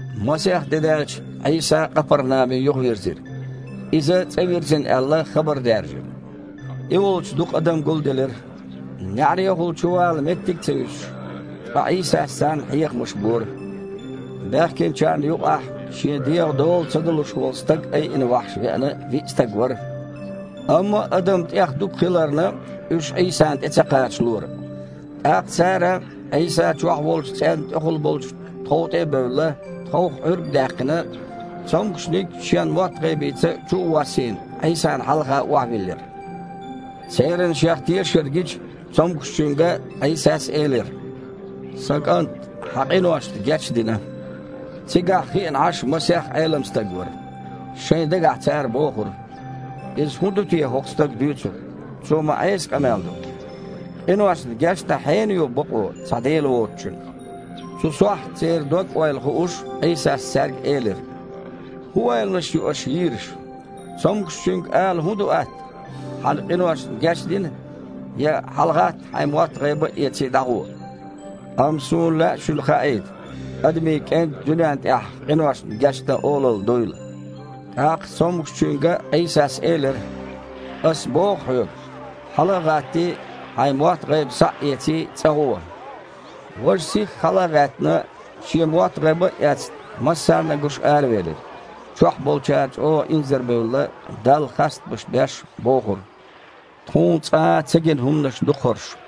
Масех де даьлча, Іийса Къапарнаме юхавирзира. Иза цІа вирзина аьлла, хабар даьржира. И волчу дукха адам гулделира, неІарехула чувала меттиг а ца юьсуш, ткъа Іийсас царна хьехамаш бора. Баьхкинчарна юкъахь шен дегІан дола ца далуш волу стаг айина вахьаш веана виъ стаг вара. Амма адам тІех дукха хиларна, уьш Іийсана тІе ца кхачалора. ТІаккха цара, Іийса чохь волчу цІенна тІехула болчу тхов тІе а бевлла, тховх Іуьрг а даьккхина, цомгушниг шен мотт-гІайбица чу а воссийна, Іийсана хьалха охьавиллира. Церан Шех тешар гича, цомгушчуьнга Іийсас элира: «Сан кІант, хьан къиношна гечдина». Цигахь хиъна Іаш масех Іелам стаг вара. Шайн дагахь цара бохура: «Иза хІун ду те хІокху стага дуьйцург? Цо ма Іеса къамел до. Къиношна гечдан хьенан бакъо ю, цхьа Дела воцучун?» Цу сохьта, церан дог-ойла хууш, Іийсас цаьрга элира: «ХІун ойланаш ю аша йийраш? Цомгушчуьнга ала хІун ду атта: „Хьан къиношна гечдина“, я: „ХьалагІатта, хьайн мотт-гІайба а эций, дІагІо“? Амма Суна лаьа шуна хаийта Адамийн КІентан дуьнен тІехь къиношна гечдан олалла дуйла». ТІаккха цомгушчуьнга Іийсас элира: «Ас боху хьоьга! Хьала а гІаттий, хьайн мотт-гІайба схьа а эций, цІа гІуо!» Важа, сихха хьала а гІаьттина, шен мотт-гІайба а эцна, массарна а гуш аравелира. Чохь болчара чІогІа инзарбевлла, Далла хастамаш беш, бохура: «Тхуна цкъа а ца гина хІуманаш ду-кх хІорш!»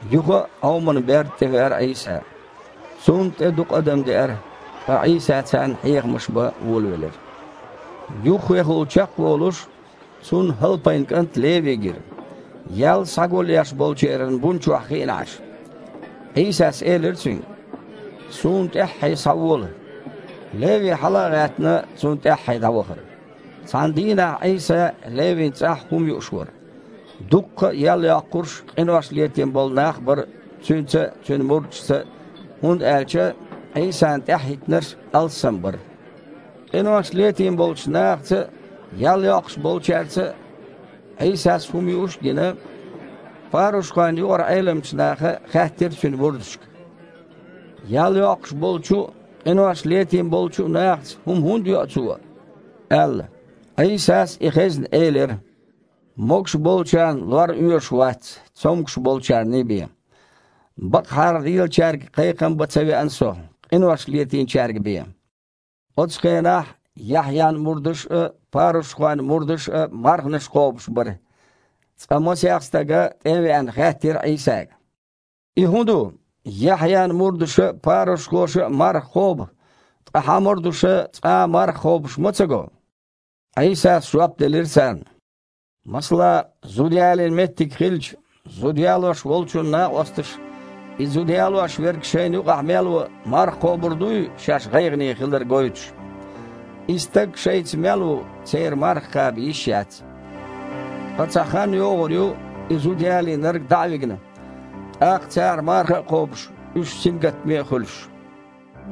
Юха а Іоман берда тІе веара Іийса. Цунна тІе дукха адам деара, ткъа Іийса царна хьехамаш бан волавелира. Юххехула чекхволуш, Цунна ХІалпайн кІант Леви гира, ял схьагулъеш болчеран бун чохь хиъна Іаш. Іийсас элира цуьнга: «Суна тІаьххье схьавола!» Леви, хьала а гІаьттина, Цунна тІаьххье дІавахара. Цхьана дийнахь Іийса Левин цІахь хІума юуш вара. Дуккха а ял йоккхурш а, къинош летийна болу нах а бара Цуьнца а, Цуьнан мурдашца а, хІунда аьлча Іийсана тІаьхьахІиттинарш алссам бара. Къинош летийна болчу нахаца а, ял йоккхуш болчаьрца а Іийсас хІума юуш а гина, парушхойн юкъара Іеламчу наха хаьттира Цуьнан мурдашка: «Ял йоккхуш болчу а, къинош летийна болчу а нахаца хІума хІунда йоу Цо?» – аьлла. Іийсас, и хезна, элира: «Могуш болчарна лор оьшуш вац, цомгуш болчарний бен. Бакъахьара лелачаьрга кхайкхам бан ца веана Со, къинош летийначаьрга бен». Оцу хенахь Яхьъян мурдаш а, парушхойн мурдаш а марханаш кхобуш бара. Цкъа масех стага, тІе а веана, хаьттира Іийсага: «И хІун ду? Яхьъян мурдаша а, парушхоша а марха кхобу, ткъа Хьан мурдаша цкъа а марха кхобуш ма ца го?!» Іийсас жоп делира царна: «Масала, зуда ялийна меттиг хилча, зуда ялош волчун накъосташа и зуда ялош верг шайна юкъахь мел ву, марха кхобур дуй, шаьш гІайгІане хилар гойтуш? И стаг шайца мел ву, церан марха кхаба йиш яц. Ткъа цхьа хан йогІур ю, и зуда ялийнарг дІа а вигна, тІаккха цара марха а кхобуш, уьш сингаттаме а хуьлуш».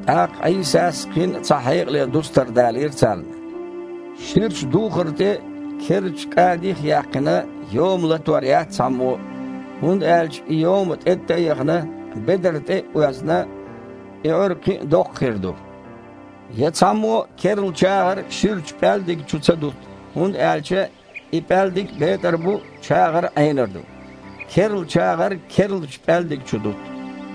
ТІаккха Іийсас кхин а цхьа хьекъале дустар далийра царна: «Ширачу духар тІе, керлачу кІадих а яьккхина, йома латор яц цхьаммо а, хІунда аьлча и йома тІеттІа а яхана, бедар тІе а оьзна, и Іуьрг кхин а доккха хир ду. Я цхьаммо а керла чагІар ширачу пІаьлдиг чу ца дутту, хІунда аьлча и пІаьлдиг а бетІар бу, чагІар а Іенар ду. Керла чагІар керлачу пІаьлдиг чу дутту».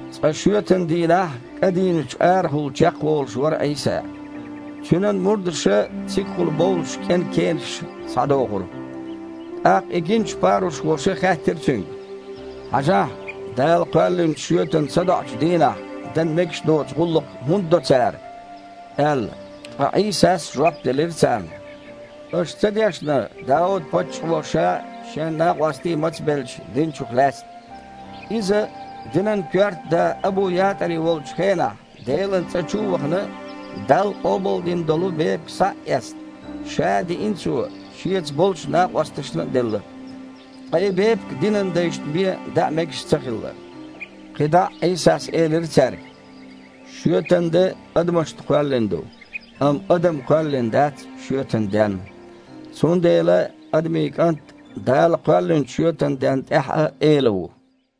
Цкъа шоьтан дийнахь кІа дийначу арахула чекхволуш вара Іийса. Цуьнан мурдаша цигахула бовлуш кІен кенаш схьадохура. ТІаккха и гиначу парушхоша хаьттира Цуьнга: «Хьажахь, Дала кхоьллинчу шоьтан садоІучу дийнахь дан мегаш доцу гІуллакх хІунда до цара?» – аьлла. Ткъа Іийсас жоп делира царна: «Аша ца дешна, Дауд-паччахьо ша а, шен накъостий а мацбелча, динчух лаьцна? Иза, динан коьрта да Абу-ЯтІари волчу хенахь, Делан цІа чу а вахана, Далла къобалдина долу бепиг схьа а эцна, ша а диина цо, шеца болчу накъосташна а делла. Ткъа и бепиг динан дайшна бен даа мегаш ца хилла». КхидІа а Іийсас элира цаьрга: «Шоьтан де адамашна кхоьллина ду, амма адам кхоьллина дац шоьтан денна. Цундела Адамийн КІант Дала кхоьллинчу шоьтан денна тІехь а Эла ву».